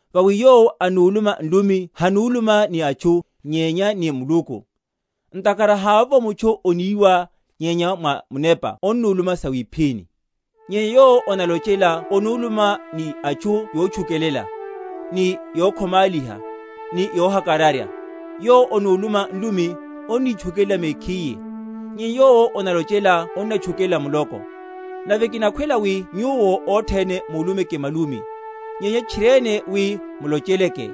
Vawi yowo anuluma nlumi hanuluma ni atchu, nyenya ni Muluku; ntakhara havovo mutchu oniwa, nyenya mwa munepa onnuluma sawiphíni. Nyenya yowo onalochela onuluma ni atchu yotchukelela, ni yokhomáliha, ni yohakararya. Yowo onuluma nlumi, onitchukelela mekhiye, nyenya yowo onalochela onatchukelela muloko. Nave kinakhwela wi nyuwo othene mulumeke malumi, nyenya tchiriene wi mulocheleke;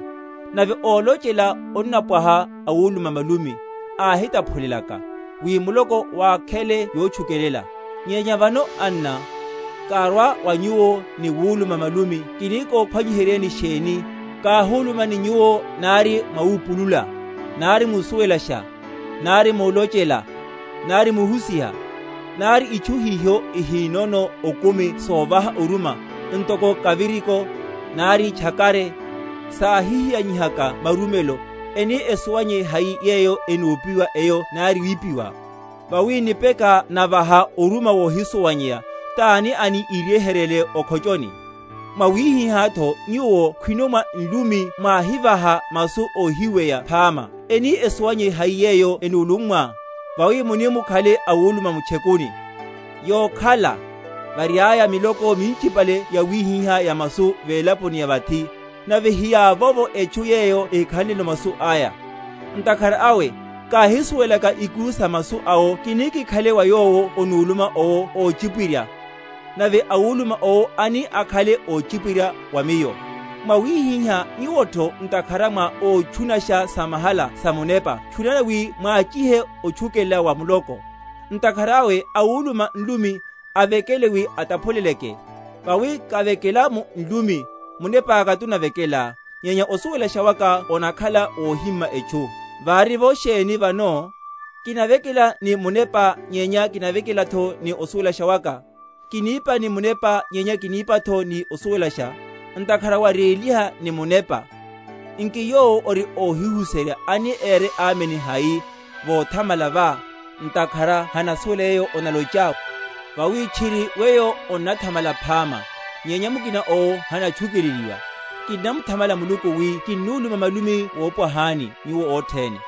nave ólochela onnampwaha awuluma malumi, ahitaphulelaka, wi muloko wakhele yotchukelela. Nyenya vano, anna, karwa wa nyuwo ni wuluma malumi, kini kophwanyiheryeni sheni, káhuluma ni nyuwo nari mwawupulula, nari musuwelasha, nari mulochela, nari muhusiha? Nari itchu hiho ihinono okumi sovaha oruma, ntoko kariviko, nari tchakare, sáhihiyanihaka marumelo, eni esuwanyeye hai yeyo enopiwa eyo nari wipiwa? Vawi nipeka navaha oruma wohisuwanyeya, tani ani iryeheryele o’khochoni? Mwawihihátho nyuwo khwino mwa nlumi mwáhivaha masu óhíweya phama, eni esuwanyeye hai yeyo enulummwa? Vawi muni mukhale awuluma mu’tchekuni. Yokhala, variaya, miloko minchipale yawihiha ya masu velaponi ya vathi, nave hiyavovo etchu yeyo ehikhanleno masu aya. Ntakhara awe, káhisuwelaka ikuru sa masu awo kini kikhale wa yowo onuluma owo óchipwirya, nave awuluma owo ani akhale óchipwirya wa miyo. Mwawihihá nyuwotho ntakhara mwa ótchunasha samahala samunepa, tchunani wi mwachihe otchukelela wa muloko. Ntakhara awe awuluma nlumi, avekele wi ataphuleleke. Vawi kavekela mu nlumi, munepáka tunavekela, nyenya osuwelasha waka onakhala wohima etchu. Vari’vo sheni vano? Kinavekela ni munepa, nyenya kinavekelatho ni osuwelasha waka: kinipa ni munepa, nyenya kinipatho ni osuwelasha. Ntakhara waréliha ni munepa, nki yowo ori óhihuserya ani ére Amen hai, vothamala vá, ntakhara hanasuwela yeyo onalochá? Vawi tchiri weyo onnathamala phama, nyenya mukina owo hanatchukeleliwa. Kinnamuthamala Muluku wi kinnuluma malumi wopwahani nyuwo othene;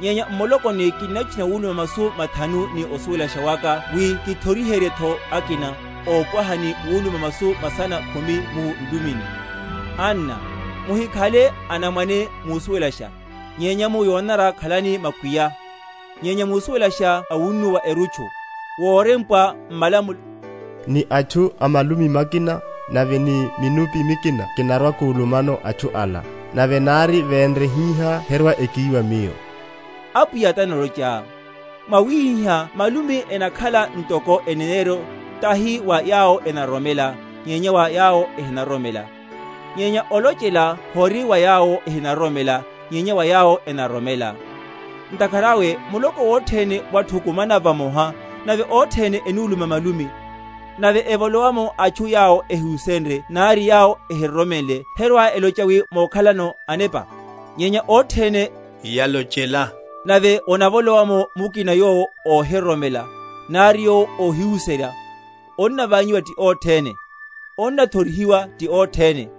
nyenya m’mulokoni kinnatchuna wuluma masu mathanu ni osuwelasha waka wi kithoriheryetho akina, opwaha ni wuluma masu masana khumi mu nlumini. Anna, muhikhale anamwane musuwelasha, nyenya mu yonanara khalani makwiya, nyenya musuwelasha awunnuwa erutchu. Worempwa m’malamulo, Ni atchu a malumi makina nave ni minuphi mikina kinarwa‐kulumano atchu ala; nave nari venre hihá herwa‐ekíwa Miyo, Apwiya tanalochaya. Mwawihihá malumi enakhala ntoko eneneryo, tahi wa yawo enaroromela, nyenya wa yawo ehinaroromela; nyenya olochela hori wa yawo ehinaroromela, nyenya wa yawo enaroromela. Ntakhara awe, muloko wothene wathukumana vamoha, nave othene enuluma malumi, nave evolowe’mo atchu yawo ehihusenrye nari yawo ehiroromenle, herwa‐elocha wi mokhala anepa? Nyenya othene yalochela, nave onavolowa’mo mukina yowo ohinaroromela, nari yowo ohihusenrye, onnavanyiwa ti othene; onnathorihiwa ti othene;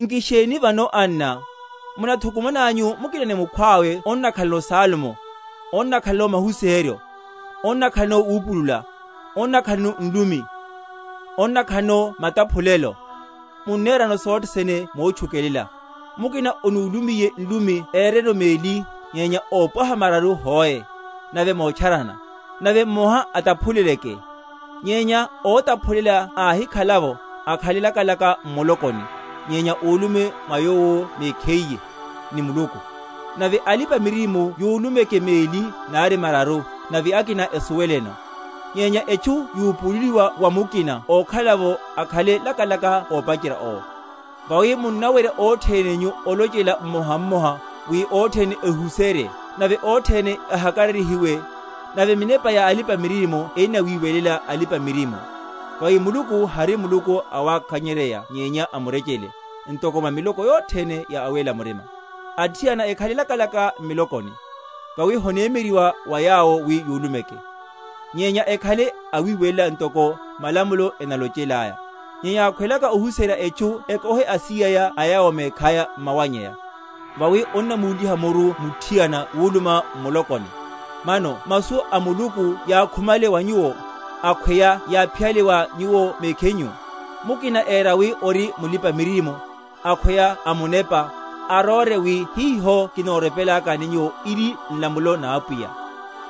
Nki sheni vano, anna? Munathukumananyu mukina ni mukina onnakhalano salmo, onnakhalano mahusiheryo, onnakhalano wupulula, onnakhalano nlumi, onnakhalano mataphulelo. Munnerano sothe sene motchukelela. Mukina onulumiye nlumi ereno meli, nyenya ópwaha mararu hoe, nave motcharana; nave mmoha ataphuleleke. Nyenya ótaphulela áhikhala’vo, akhale lakalaka m’mulokoni, nyenya ulume mwa yowo mekhiye, ni Muluku. Nave alipa‐miririmo yulumeke meli nari mararu, nave akina esuweleno. Nyenya etchu yupululiwa wa mukina ókhala’vo, akhale lakalaka ópacherya owo. Vawi munnawerya othene nyu olochela mmoha mmoha, wi othene ehuserye, nave othene ehakararyihiwe; nave minepa ya alipa‐miririmo ennawiwelela alipa‐miririmo; vawi Muluku hari Muluku awakanyerya nyenya a murechele; ntoko mwa miloko yothene ya awéla murima. Athiana ekhale lakalaka m’milokoni. Vawi honemyeryeryiwa wa yawo wi yulumeke. Nyenya ekhale awiwelela, ntokotho malamulo enalochelaya. Nyenya yakhwelaka ohuserya etchu ekohe asíyaya a yawo mekhaya m’mawannyaya; vawi onnamúliha muru muthiana wuluma m’mulokoni. Mano masu a Muluku yákhumale wa nyuwo? akhweya yáphiyale wa nyuwo mekhinyu? Mukina éra wi ori mulipa‐miririmo, akhweya amunepa, aróre wi hiho kinorepelakani nyuwo iri nlamulo na Apwiya.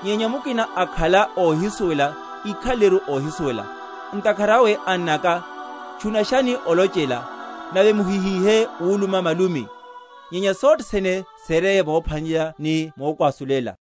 Nyenya mukina akhala óhisuwela, ikhaleleru óhisuwela. Ntakhara awe, annaka, tchunashani olochela, nave muhihíhe wuluma malumi. Nyenya sothe sene sereye mophwanelela ni mokwasulela.